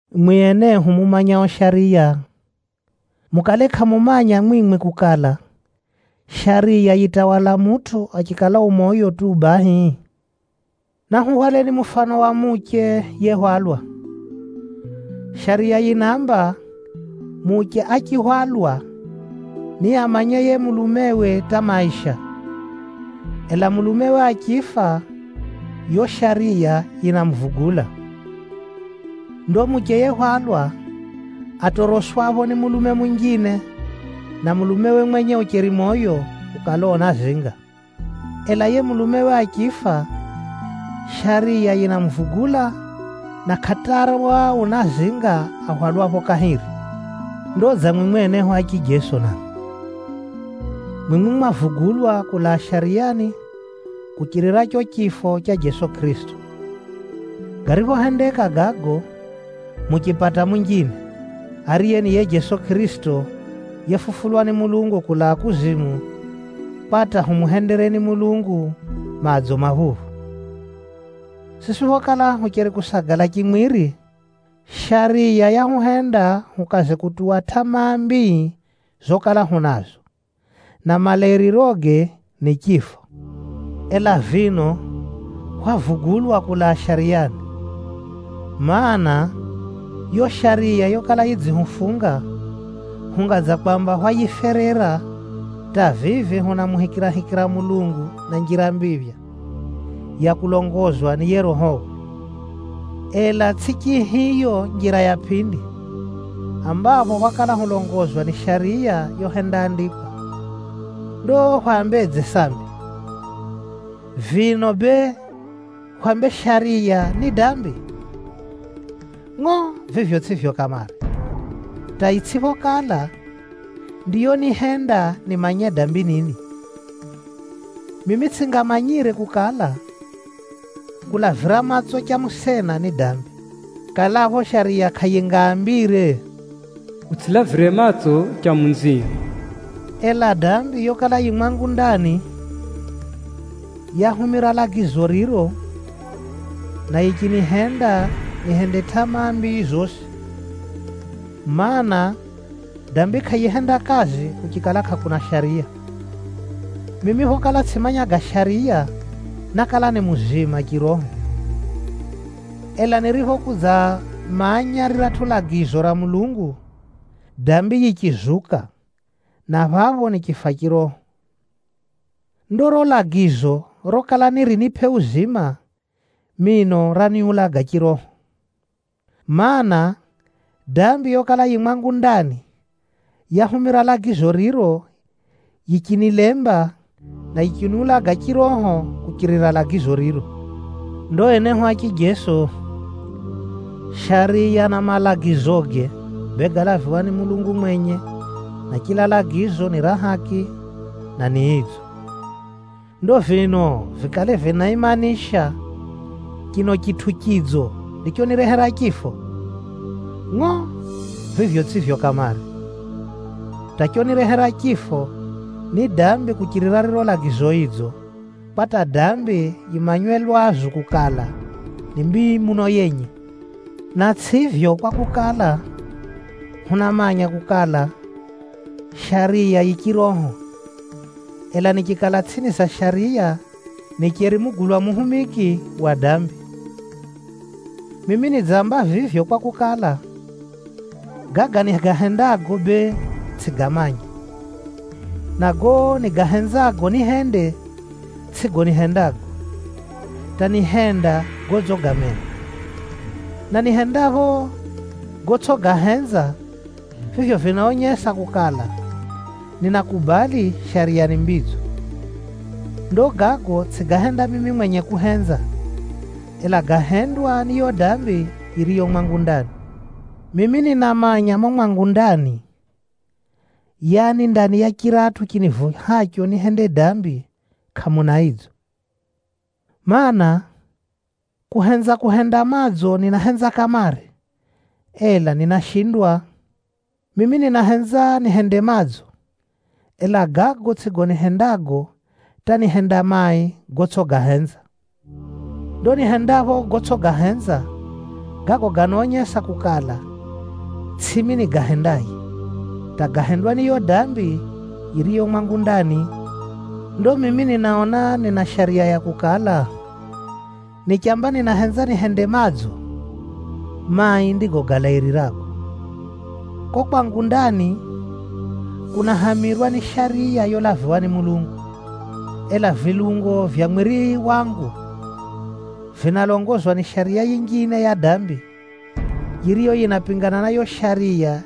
Mwi enehu mumanyao Shariya, mukale kʼamumanya mwimwi kukala, Shariya yitawala mutʼu achikala u moyo tu bahi? Nahuhwaleni mufano wa muche yehwalwa. Shariya yinaamba, muche achihwalwa, niamanye yiye mulumewe hata maisha, ela mulume achifa, yo shariya yinamuvugula. Ndo muche yehwalwa, atoroswapho ni mulume munjine na mulumewe mwenye ucheri moyo, ukala unazinga. Ela yiye mulumewe achifa, shariya yinamuvugula, na kʼatarwa unazinga ahwalwapho kahiri. Ndo dza mwimwi enehu a chijeso namwi. Mwimwi mwavugulwa kulaa Shariyani kuchirira cho chifo cha Jeso Kʼirisito. Gariphohendeka gago, muchipata munjine, ariye ni yiye Jeso Kʼirisito yefufulwa ni Mulungu kulaa kuzimu, kwa hata humuhendereni Mulungu madzo maphuphu. Siswi phokala hucheri kusagala chimwiri, Shariya yahuhenda hukaze kutuwa tʼamaa mbii zokala hunazo, na malairiroge ni chifo. Ela vino hwavugulwa kulaa Shariyani, mana, yo Shariya yokala yidzihufunga, hunga dza kwamba hwayiferera hata vivi hunamuhikirahikira Mulungu na njira mbiphya ya kulongozwa ni yiye Rohowe. Ela tsʼi chihiyo njira ya pʼindi, ambapho hwakala hulongozwa ni Shariya yohendaandikwa. Ndo hwambedze sambi? Vino bee, hwambe Shariya ni dambi? Ngʼo! Vivyo tsʼivyo kamare, hata itsʼiphokala, ndiyonihenda nimanye dambi nini. Mimi tsʼingamanyire kukala, kulavira matso cha musena ni dambi, kalapho Shariya kʼayingaambire, “Utsʼitamani cha munzio.” Ela dambi yokala yi mwangu ndani, yahumira lagizo riro, na yichinihenda nihende tʼamaa mbii zosi. Maana, dambi kʼayihenda kazi kuchikala kʼakuna shariya. Mimi phokala tsʼimanya ga Shariya, nákala ni muzima chiroho. Ela niriphokudzamanya riratʼu lagizo ra Mulungu, dambi yichizuka, na phapho nichifa chiroho. Ndo riro lagizo rokala nirinipʼe uzima, mino raniulaga chiroho. Maana, dambi yokala yi mwangu ndani, yahumira lagizo riro yichinilemba, na yichiniulaga chiroho kuchirira lagizo riro. Ndo enehu a chijeso, Shariya na malagizoge, bee gálaviwa ni Mulungu mwenye, na chila lagizo ni ra haki, na ni idzo. Ndo vino vikale vinaimanisha, chino chitʼu chidzo ndichonirehera chifo? Ngʼo! Vivyo tsʼivyo kamare, hata chonirehera chifo ni dambi kuchirira riro lagizo idzo, kwa hata dambi yimanywe lwazu kukala, ni mbii muno yenye. Na tsʼivyo kwakukala, hunamanya kukala, Shariya yi chiroho, ela nichikala tsʼini za Shariya, nicheri mugulwa muhumiki wa dambi. Mimi nidzamba vivyo kwakukala, gaga nigahendago bee, tsʼigamanya, na gago nigahenzago nihende, tsʼigo nihendago, hata nihenda godzigamena. Na nihendapho gotsʼigahenza, vivyo vinaonyesa kukala, ninakubali Shariya ni mbidzo. Ndo gago tsʼigahenda mimi mwenye kuhenza, ela gahendwa ni yo dambi yiriyo mwangu ndani. Mimi ninamanya mumo mwangu ndani, yaani ndani ya chiratʼu chinivuhacho nihende dambi, kʼamuna idzo. Maana, kuhenza kuhenda madzo ninahenza kamare, ela ninashindwa. Mimi ninahenza nihende madzo, ela gago tsʼigo nihendago hata nihenda mai gotsʼigahenza. Ndo nihendapho gotsʼigahenza, gago ganaonyesa kukala, tsʼimi nigahendaye, hata gahendwa ni yo dambi yiriyo mwangu ndani. Ndo mimi ninaona nina shariya ya kukala, nichamba ninahenza nihende madzo, mai ndigo galairirago. Ko kwangu ndani, kunahamirwa ni Shariya yolaviwa ni Mulungu. Ela vilungo vya mwiri wangu, vinalongozwa ni shariya yinjine ya dambi, yiriyo yinapingana na yo Shariya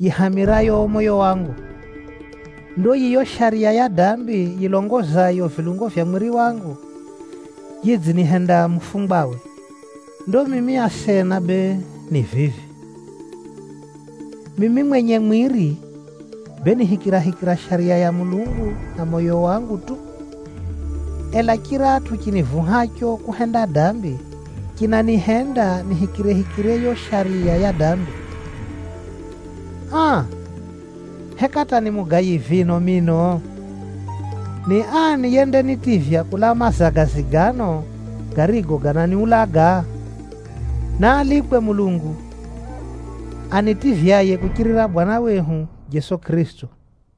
yihamirayo moyo wangu. Ndo yiyo shariya ya dambi yilongozayo vilungo vya mwiri wangu, yidzinihenda mufungwawe. Ndo mimi asena bee ni vivi: mimi mwenye mwiri, bee nihikirahikira Shariya ya Mulungu na moyo wangu tu. Ela chiratʼu chinivuhacho kuhenda dambi, chinanihenda nihikirehikire yo shariya ya dambi. Aa! Heka hata ni mugayi vino mino? Ni ani yendanitivya kulaa mazagazi gano garigo gananiulaga? Naalikwe Mulungu, anitivyaye kuchirira Bwana wehu Jeso Kʼirisito!